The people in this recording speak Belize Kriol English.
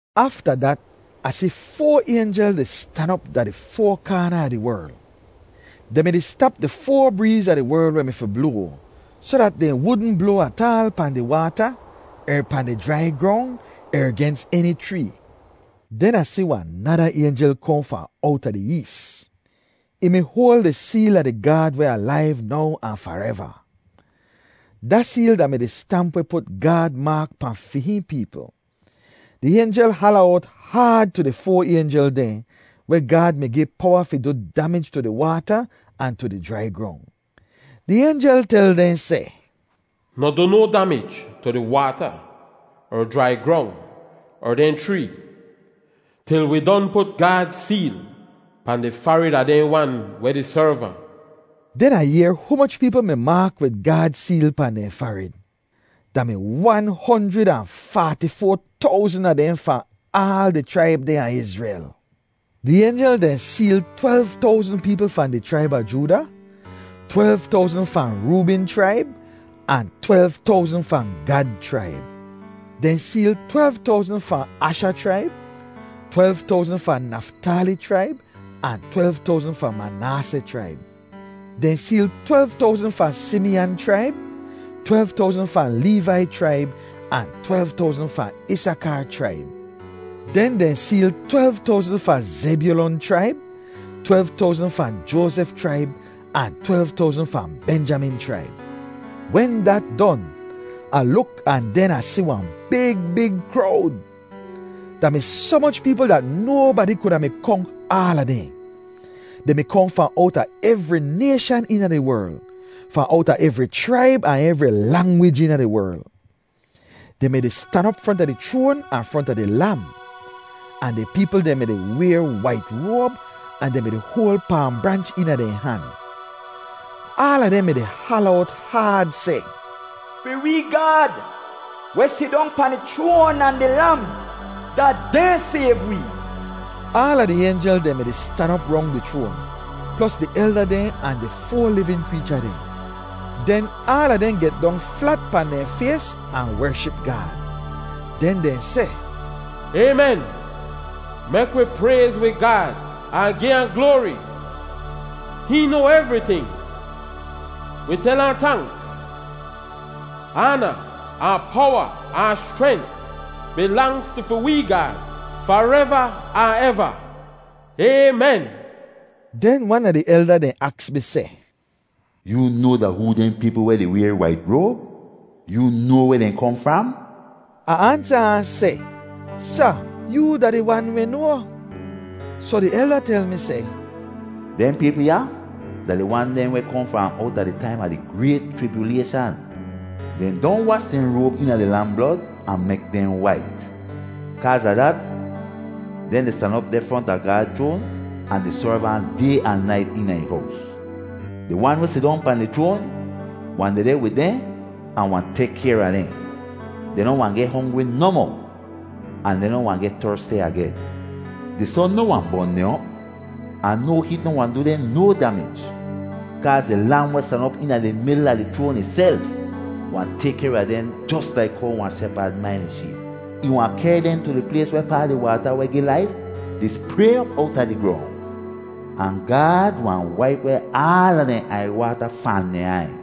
Afta dat, Ah si foa aynjel di stan op da di foa kaana a di werl. Dehn mi-di stap di foa breez a di werl weh mi fi bloa, soh dat dehn wudn bloa ataal pahn di waata er pahn di jrai grong er gens eni chree. Den Ah si wahn nada aynjel kohn fahn owta di ees. Ih mi hoal di seel a di Gaad weh alaiv now ahn fareva. Da seel da-mi di stamp weh put Gaad maak pahn fi hihn peepl. Di aynjel hala owt haad tu di foa aynjel dehn weh Gaad mi gi powa fi du damij tu di waata ahn tu di jrai grong. Di aynjel tel dehn seh, “Noh du no damij tu di waata er jrai grong er dehn chree, til wi don put Gaad seel pahn di farid a dehn wan weh di serv ahn.” Den Ah yehr humoch peepl mi maak wid Gaad seel pahn dehn farid. Da mi wan honjrid ahn faati-foa towzn a dehn fahn aal di chraib dehn a Izrel. Di aynjel dehn seel twelv towzn peepl fahn di chraib a Jooda, twelv towzn fahn Roobin chraib, ahn twelv towzn fahn Gad chraib. Dehn seel twelv towzn fahn Asha chraib, twelv towzn fahn Naftali chraib, ahn twelv towzn fahn Manaaseh chraib. Dehn seel twelv towzn fahn Simiyan chraib, twelv towzn fahn Leevai chraib, ahn twelv towzn fahn Isakar chraib. Den dehn seel twelv towzn fahn Zebyulon chraib, twelv towzn fahn Joazef chraib, ahn twelv towzn fahn Benjamin chraib. Wen dat don, Ah luk ahn den Ah si wahn big big krowd. Da mi soh moch peepl dat nobadi kuda mi konk aala dehn. Dehn mi kohn fahn owta evri nayshan eena di werl, fahn owta evri chraib ahn evri langwij eena di werl. Dehn mi-di stan op fronta di chroan ahn fronta di Lam. Ahn di peepl dehn mi-di wayr wait roab ahn dehn mi-di hoal paam branch eena dehn han. Aala dehn mi-di hala owt haad seh, “Fi wee Gaad, weh sidong pahn di chroan, ahn di Lam, da dehn sayv wee!” Aala di aynjel dehn mi-di stan op rong di chroan, plos di elda dehn ahn di foa livin kreecha dehn. Den aala dehn get dong flat pahn dehn fays ahn wership Gaad. Den dehn seh, “Aymen! Mek wi prayz wi Gaad ahn gi ahn gloari! Hihn noa evriting! Wi tel ahn ‘Tanks.’ Aana ahn powa ahn schrent bilangz tu fi wee Gaad fareva ahn eva! Aymen!” Den wan a di elda dehn aks mi seh, “Yoo noa da hoo dehn peepl weh di wayr wait roab? Yoo noa weh dehn kohn fram?” Ah ansa ahn seh, “Sa, yoo da di wan weh noa.” Soh di elda tel mi seh, “Dehn peepl ya da di wan dehn weh kohn fahn owta di taim a di grayt chribyulayshan. Dehn don wash dehn roab eena di Lam blod ahn mek dehn wait. Kaaz a dat, dehn di stan op deh fronta Gaad chroan ahn di serv Ahn day ahn nait eena ih hows. Di Wan weh sidong pahn di chroan wahn dehdeh wid dehn ahn wahn tek kayr a dehn. Dehn noh wahn geh hongri nohmoh, ahn dehn noh wahn geh tersti agen. Di son noh wahn bon dehn op. Ahn no heet noh wahn du dehn no damij. Kaaz di Lam weh stan op eena di midl a di chroan ihself wahn tek kayr a dehn jos laik how wahn shepad main ih sheep. Ih wahn kehr dehn tu di plays wehpaa di waata weh gi laif di spray op owta di grong. Ahn Gaad wahn waip weh aala dehn aiywaata fahn dehn aiy.”